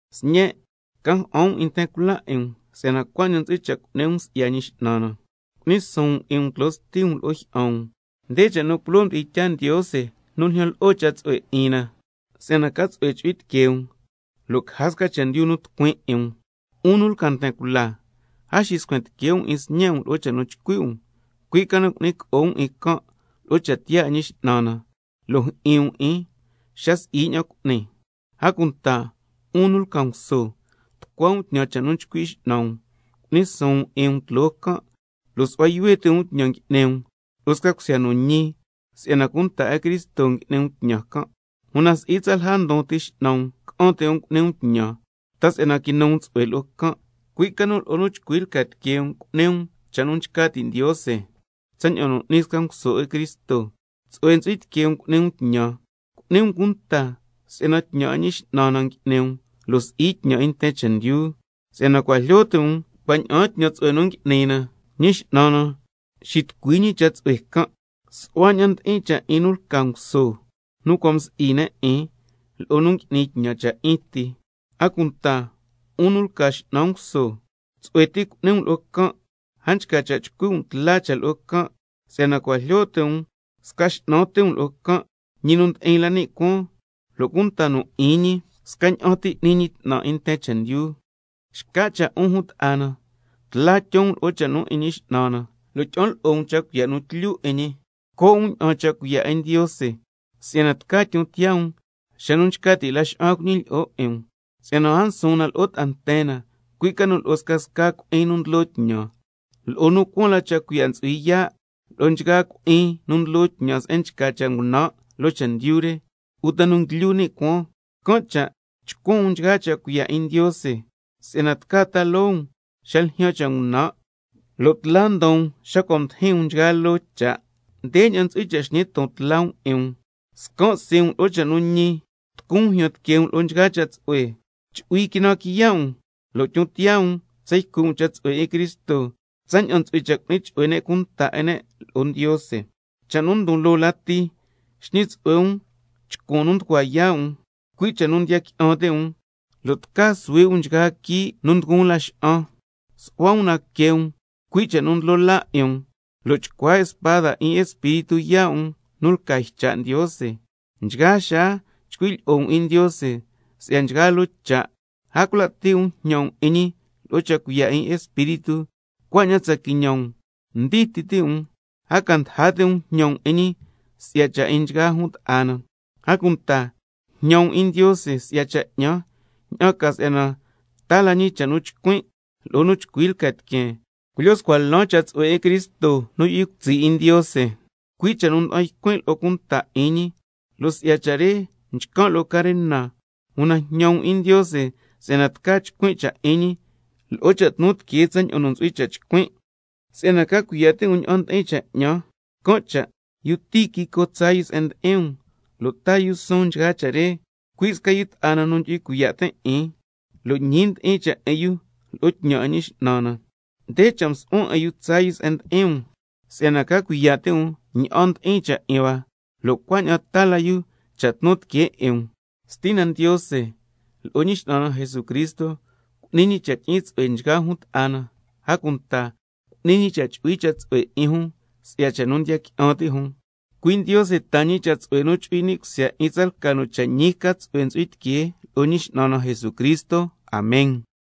Sñen', ca ja'an um 'in nten cula 'in um si'yana cuaña'an ntsu'hui cha' cu'ni um si'ya Ñi X'nan na. —Cu'ni suun um 'in um tloo sti um lo'o jyi'an um—, nde cha' nu culoo mdi'in tyaa Ndiose nu ljyan lo'o cha' tsu'hue 'in na, —si'yana ca tsu'hue chu'hui tiquee um, lo' caja sca chendyu nu tucuin 'in um—. 'Un nu lca nten cula, a xiscuen tique' um 'in sñe' um lo'o cha' nu chcui' um, cui' ca nu cu'ni co'o um 'in can' lo'o cha' tiyaa 'in Ñi X'nan na, lo' jyi'in um 'in xa si'i ña'an cu'ni. A cunta 'un nu lca nguso, tucua um tñan cha' nu chcui' x'nan um, cu'ni suun um 'in um tloo can' lo' su'hua yuhue ti' um tñan ngui'ni um lo'o sca cusya nu ñi, si'yana cunta 'in Cristo ngui'ni um tñan can', una si'i tsalja ndon ti x'nan um ca'an ti' um cu'ni um tñan, ta si'yana quinu um tsu'hue lo'o can', cui' ca nu lo'o nu chcui lca tiquee um cu'ni um cha' nu nchca ti' Ndiose tsaña'an n'ni sca nguso 'in Cristo. Tsu'hue ntsu'hui tiquee um cu'ni um tñan, cu'ni um cunta si'yana tñan 'in Ñi X'nan na ngui'ni um lo' si'i tñan 'in nten chendyu. Si'yana cua' jlyo ti' um cua' ña'aan tñan tsu'hue nu ngui'ni na, Ñi X'nan na nxitucui ñi cha' tsu'hue can', su'hua ña'an ndi'in cha' 'in nu lca nguso nu cua' msi'i ne' 'in, lo'o nu ngui'ni tñan cha' 'in ti. A cunta 'un nu lca x'nan nguso, tsu'hue ti cu'ni um lo'o can', a nchca cha' chcui' tla um, si'yana cua' jlyo ti' um sca X'nan ti um lo'o can', ñi nu ndi'in la ni' cuaan, lo' cunta nu 'in ñi scaña'an ti n'ni ñi 'tnan 'in nten chendyu. Xca cha' 'un jun ta'a na, tla tyon um lo'o Ñi X'nan na, lo' tyi'an lo'o um cha' cuiya' nu tlyu 'in ñi. Co' um ña'aan cha' cuiya' 'in Ndiose, si'yana tca tyon tiyaa um xa nu nchca ti' laxa'an cuñilyi'o 'in um. Si'yana a nsuun na lo'o ta'a nten na, cui' ca nu lo'o scasca cui'in nu ndlo tñan, lo'o nu cuaan la cha' cuiya' ntsu'hui yaa', lo'o nchgaa cui'in nu ndlo tñan se'en nchca cha' ngunan' loo chendyu re, uta nu nguilyu ni' cuaan. Can' cha' chcuan um nchgaa cha' cuiya' 'in Ndiose, si'yana tca ta loo um xa ljyaan cha' ngunan', lo' tla ndon um xa cua' mdijin um nchgaa loo cha'. Ndeña'an ntsu'hui cha' xñi ton tla um 'in um, —scan' sii' um lo'o cha' nu ñi, tucun um jyan tiquee um lo'o nchgaa cha' tsu'hue, chu'hui quinan quiya' um, lo' tyon tiyaa um tsa ycui' um cha' tsu'hue 'in Cristo tsaña'an ntsu'hui cha' cu'ni chu'hue ne' cunta 'in ne' lo'o Ndiose—. Cha' nu ndon loo lati, xñi tsu'hue um chcuan nu nducua yaa' um, cui' cha' nu ndiya qui'an ti' um, lo' tca suhui' um nchgaa quii' nu nduguun laxa'an. —Su'hua um na que um, cui' cha' nu ndlo laa 'in um—, lo' chcua spada 'in Espíritu yaa' um nu lca ycha' Ndiose, nchgaa xaa chcui' lyi'o um 'in Ndiose si'ya nchgaa loo cha', a cula' ti' um jñan um 'in ñi lo'o cha' cuiya' 'in Espíritu, cuaña'an tsa quiñan um ndii ti' um, a ca ndaja ti' um jñan um 'in ñi si'ya cha' 'in nchgaa jun ta'a na. A cunta jñan um 'in Ndiose si'ya cha' 'ñan, ña'an ca si'yana taa la ñi cha' nu chcuin' lo'o nu chcui lca tiqueen, culyo scua lan cha' tsu'hue 'in Cristo nu yu'hui cutsi' 'in Ndiose, cui' cha' nu nda'an ycuin' lo'o cunta 'in ñi, lo' si'ya cha' re nchcan' lo'o carena, una jñan um 'in Ndiose si'yana tca chcuin' cha' 'in ñi lo'o cha' tnu tiqueen tsaña'an nu ntsu'hui cha' chcuin'. Si'yana ca cuiya' ti' um ña'an ndi'in cha' 'ñan, can' cha' yu Tíquico tsaa yu se'en ndi'in um lo' taa yu suun nchgaa cha' re, cui' sca yu ta'a na nu ndyu'hui cuiya' tin' 'in, lo' ñi ndi'in cha' 'in yu lo'o tñan 'in Ñi X'nan na. Nde cha' msu'huan 'in yu tsaa yu se'en ndi'in um, si'yana ca cuiya' ti' um ña'an ndi'in cha' 'in hua, lo' cuaña'an taa la yu cha' tnu tiquee 'in um. Stina Ndiose lo'o Ñi X'nan na Jesucristo cu'ni ñi cha' tyi'in tsu'hue nchgaa jun ta'a na, a cunta cu'ni ñi cha' chu'hui cha' tsu'hue 'in jun scasca jun si'ya cha' nu ndiya qui'an ti' jun. Cui' Ndiose taa ñi cha' tsu'hue nu chu'hui ni' cusya 'in tsalca nu cha' ñi ca tsu'hue ntsu'hui tiquee lo'o Ñi X'nan na Jesucristo. Amen.